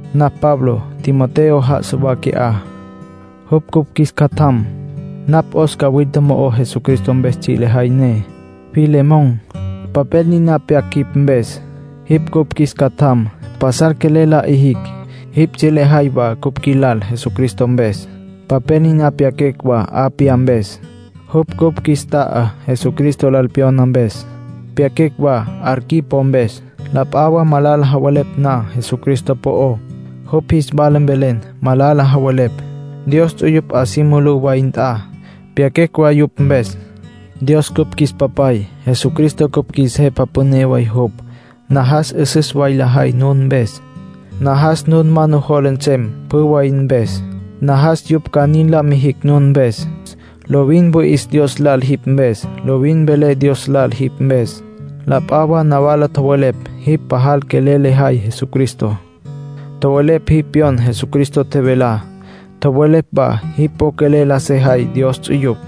Napj Pablo. Timoteo já'asa wa qui'á. Jupj cupj qjuis catjam. Napj 'os cawilta mo'ó Jesucristo mpes tsji' lejay ne. Filemón, papel niná pyaquecj jipj mpes. Jipj cupj qjuis catjam. Pasal quelel la 'ijicj. Jipj tsji' lejay wa cupj qjuilal Jesucristo mpes. Papel niná pyaquecj wa Apia mpes. Jupj cupj qjuis ta'a, Jesucristo lal pyona mpes. Pyaquecj wa Arquipo mpes. La p'a wa malala javelepj na Jesucristo po'ó, jupj jis wala vele malala javelepj. Dios ts'uyupj 'a si mulú wya nt'a. Pyaquecj wa yupj mpes. Dios cupj qjuis Papay. Jesucristo cupj qjuis Jepa Püné way jupj. Najas 'üsüs way lajay nun mpes. Najas nun ma nujola nsem pjü way mpes; najas yupj ca nin la mijicj nun mpes. Lovin wüi'is Dios lal jipj mpes. Lovin velé Dios lal jipj mpes. La p'a wa nawala tjowelepj jipj pajal quelel lejay Jesucristo. Tjowelepj jipj pyon Jesucristo tjevelá. Tjowelepj wa jipj po quelel la sejay Dios ts'uyupj.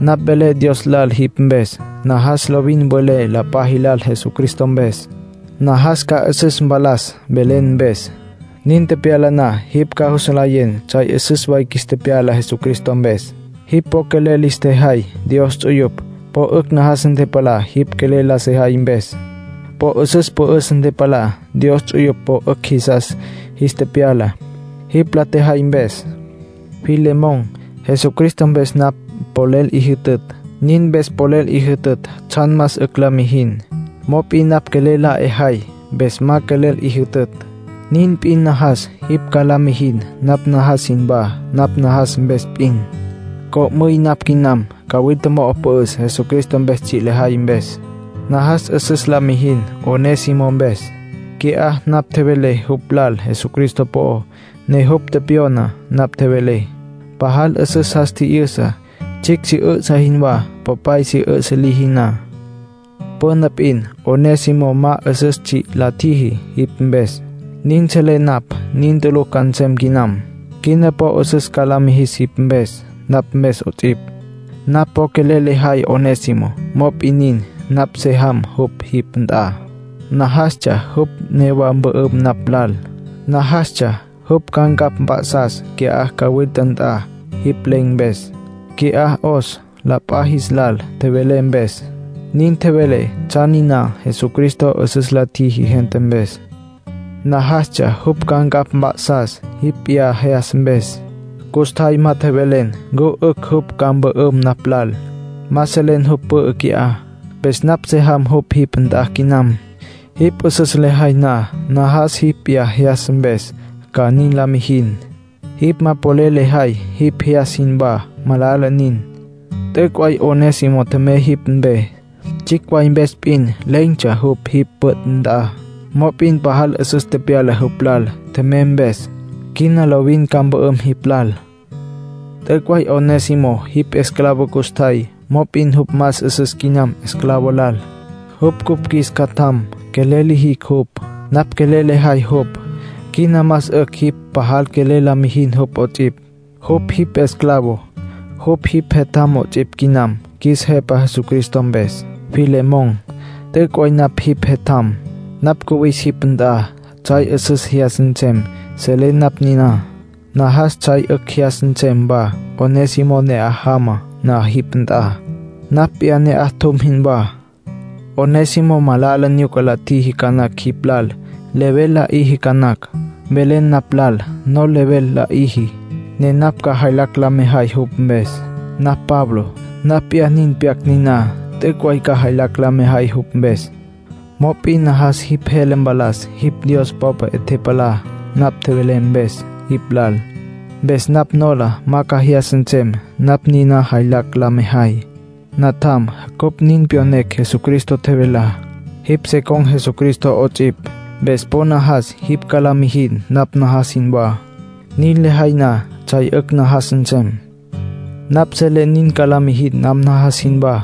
Napj velé Dios lal jipj mpes. Najas lovin mvelen la p'a jilal Jesucristo mpes. Najas ca 'üsüs mpalas velen mpes. Nin tepyala na, jipj ca jus nlayen tsjay 'üsüs qjuis tepyala Jesucristo mpes. Jipj po quelel lis tjejay Dios ts'uyupj. Po 'ücj najas ntepalá jipj quelel la sejay mpes. Po 'üsüs pü'üs ntepalá. Dios ts'uyupj po 'ücj jisas jis tepyala, jipj la tjejay mpes. Filemón, Jesucristo mpes napj polel 'i jütütj. Nin mpes polel 'i jütütj tsjan más 'ücj la mijin. Mop'in napj quelel la 'e jay, mpes ma quelel 'i jütütj. Nin p'in najas jipj ca la mijin napj najas jinwá napj najas mpes p'in. Co'müy napj quinam. Cawilta mo'o pü'üs Jesucristo mpes tsji' la tjejay mpes. Najas 'üsüs la mijin Onésimo mpes. Qui'á napj tjevelé jupj lal Jesucristo po'ó, ne jupj tepyona napj tjevelé. Pajal 'üsüs jas tji'yüsa, tsjicj si 'üsǘ jinwá popay si 'üsǘ liji na. Püna p'in Onésimo ma 'üsüs tsji' la tjiji jipj mpes, nin selé napj. Nin tulucj ca nsem quinam. Quina po 'üsüs ca la mijis jipj mpes, napj mpes 'ots'ipj. Napj po quelel lejay Onésimo. Mop'in nin, napj se jam jupj jipj nt'a. Najastsja jupj newá mpü'üm napj lal. Najastsja jupj ca ncapj mp'a'sas qui'á cawilta nt'a, jipj len̈ mpes. Qui'á 'os la p'a jis lal tjevelé mpes. Nin tjevelé tsjan niná Jesucristo 'üsüs la tjiji gente mpes. Najastsja jupj ca ncapj mp'a'sas jipj p'iyá jyas mpes. Custjay ma tjevelen ncu 'ücj jupj ca mpü'üm napj lal. Ma selen jupj pü'ü qui'á. Mpes napj se jam jupj jipj nt'a quinam. Jipj 'üsüs lejay na, najas jipj p'iyá jyas mpes ca nin la mijin. Jipj ma polel lejay jipj jyas jinwá, malala nin. T'üc' way Onésimo tjemey jipj mpe. Tsjicj way mpes p'in len̈tsja jupj jipj püt' nt'a. Mop'in pajal 'üsüs tepyala jupj lal, tjemey mpes. Quina lovin ca mpü'üm jipj lal. T'üc' way Onésimo jipj esclavo custjay. Mop'in jupj más 'üsüs quinam esclavo lal. Jupj cupj qjuis catjam. Quelel lijicj jupj. Napj quelel lejay jupj; quina más 'ücj jipj pajal quelel la mijin jupj 'ots'ipj. Jupj jipj esclavo, jupj jipj jetjam 'ots'ipj quinam qjuis Jepa Jesucristo mpes. Filemón, t'üc' way napj jipj jetjam. Napj cüwinis jipj nt'a, tsjay 'üsüs jyas nsem. Selé napj niná. Najas tsjay 'ücj jyas nsem wa Onésimo ne'aj jama na jipj nt'a, napj p'iyá ne'aj tjum jinwá. Onésimo malala nyuca la tjiji ca nacj jipj lal. Level la 'iji ca nacj. Mvelen napj lal nol level la 'iji, ne napj ca jaylacj la mejay jupj mpes. Napj Pablo. Napj p'iyá nin pyac niná. T'üc' way ca jaylacj la mejay jupj mpes. Mop'in najas jipj jele mpalas jipj Dios popa 'e tepalá napj tjevelé mpes jipj lal. Mpes napj nola ma ca jyas nsem napj niná jaylacj la mejay. Natjam, cupj nin pyonecj Jesucristo tjevelá. Jipj se con̈ Jesucristo 'ots'ipj. Mpes po najas jipj ca la mijin napj najas jinwá. Nin lejay na, tsjay 'ücj najas nsem. Napj selé nin ca la mijin napj najas jinwá.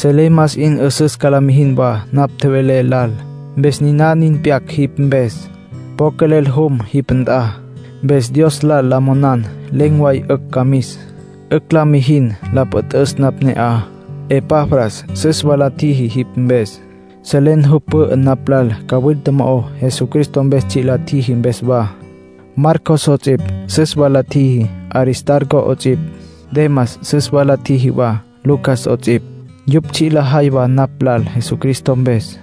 Selé más 'in 'üsüs ca la mijin wa napj tjevelé lal. Mpes niná nin pyac jipj mpes. Po quelel jum jipj nt'a. Mpes Dios lal la monan len̈ way 'ücj ca mis. 'Ücj la mijin la püt'üs napj ne'aj. Epafras süs wa la tjiji jipj mpes. Selen jupj pü'ü napj lal cawilta mo'ó Jesucristo mpes tsji' la tjiji mpes wa. Marcos 'ots'ipj süs wa la tjiji, Aristarco 'ots'ipj. Demas süs wa la tjiji wa, Lucas 'ots'ipj. Yupj tsji' lajay wa napj lal Jesucristo mpes.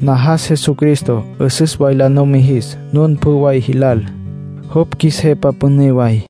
Najas Jesucristo 'üsüs way la numijis nun pjü way jilal, jupj qjuis Jepa Püné way.